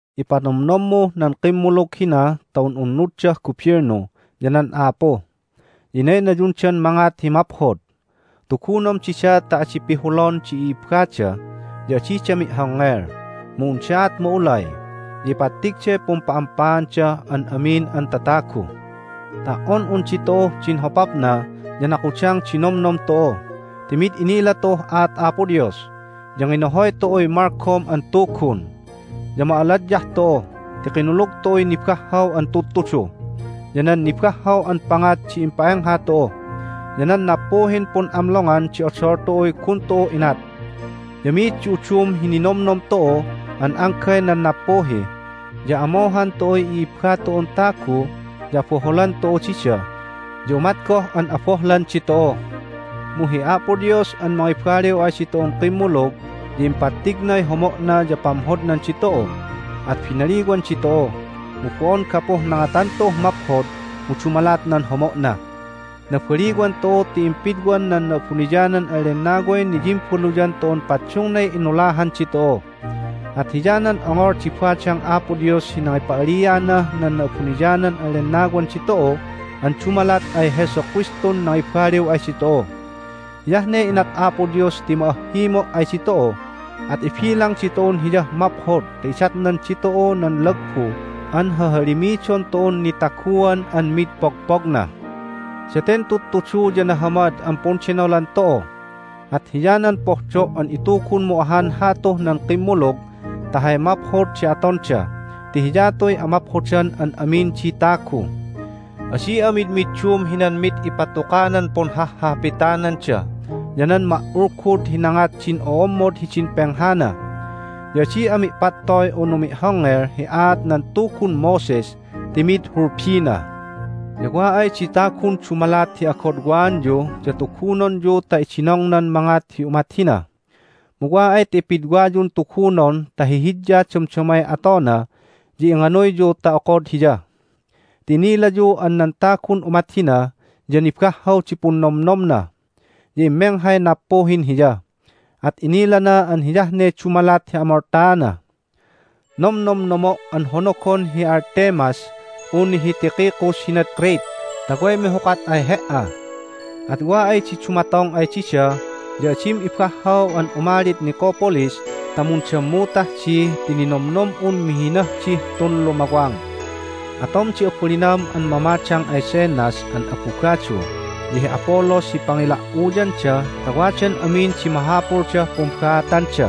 Ipanomnommuh nan kimmulug hina ta un'unnuddah gubilnu ya nan a'apu, ya inaynayundan mangat hi maphod. Tugunom dida ta adi pihulon di i'ibbada, ya adida mi'hongngel, mu undaat ma'ulay, ya ipattigday pumpa'ampaandah an amin an tatagu. Ta"on un ditu'uh din hopapna ya nakudang di nomnom tu'u ti mid innila tu'uh aat Apo Dios, ya nginohoy tu'uy malgom an tugun. Ya ma'aladyah tu'u ti kinulug tu'uy nibahhaw an tudtudu, ya nan nibahhaw an pangat di impa'engha tu'u, ya nan nappuhin pun'amlongan di odol tu'uy gun tu'u inat. Ya mi'id di udum hi ninomnom tu'u an anggay nan nappuhi, ya amohan tu'uy i'ibba tu'un tagu, ya aboholan tu'u dida, ya umat goh an abohlan ditu'u. Mu hi Apo Dios an mangibaliw ay ditu'un kimmulug ya impattignay homo'na ya pamhodnan ditu'u, at binaliwan ditu'u, mu bo'on gapuh nangatan tu'uh maphod, mu dumalat nan homo'na. Nabaliwan tu'u ti impidwan nan Na'abuniyanan an Lennaway niyimbaluyan tu'un paddungnay inulahan ditu'u. At hiyanan ongol di badang Apo Dios hi nangipa'alianah nan Na'abuniyanan an Lennawan ditu'u an dumalat ay Jesu Kristun nangibaliw ay ditu'u. Hiyah ne inat Apo Dios ti ma'ahhimo' ay ditu'u, at ibilang ditu'un Hiyah maphod ta idatnan ditu'u nan lagbu an hahalimidon tu'un nitaguan an mid pogpogna. Daten tudtudu ya nahamad an pundenolan tu'u. At hiyanan pohdo' an itugunmu ahan hatuh nan kimmulug ta hay maphod di atonda ti hiyatuy amaphodan an amin di tagu. Adi'a midmiddum hinan mid ipatukanan punhahhapitananda ya nan ma"ulgud hi nangat din o'ommod hidin penghana. Ya adi'a mi'pattoy unu mi'hongngel hi aat nan Tugun Moses ti mi'id hulbina. Ya wa ay di tagun dumalat hi agodwaanyu ya tugunonyu ta idinongnan mangat hi umat hina, mu wa ay ta ipidwayun tugunon ta hihidya damdamay atona ya inganuyyu ta okod hiya. Ti inilayu an nan tagun umat hina ya nibahhaw di punnomnomna, ya immenghay nappuhin hiya, at inilana an hiyah ne dumalat hi amoltaana. Nomnomnomo' an honogon hi Artemas unu hi Tychicus hinad Crete ta way mihukat ay he"a. At wa ay di dumatong ay dida ya adim ibahhaw an umalid Nicopolis ta mundammutah di ti ninomnom'un mihinah dih tun lumawang. Atom di abalinam an mamadang ay Zenas an abugadu ya hi Apollos hi pangila"uyanda ta wadan amin di mahapuldah pumbaatanda.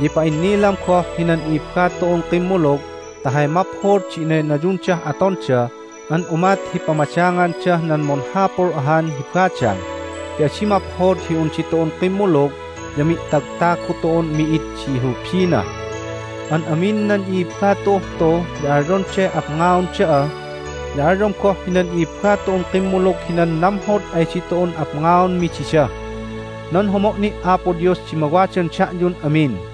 Ya ipa'innilam goh hinan i'ibba tu'un kimmulug ta hay maphod di inaynayundah atonda an umat hi pamadangandah nan munhapul ahan hi badang ti adi maphod hi un ditu'un kimmulug ya mi'tagtagu tu'un mi'id di hulbina. An amin nan i'ibba tu'uh tu ya alyonday apngaon da'a, ya alyom goh hinan i'ibba tu'un kimmulug hinan namhod ay ditu'un apngaonmi dida. Nan homo' ni' Apo Dios di mawadan da'yun amin.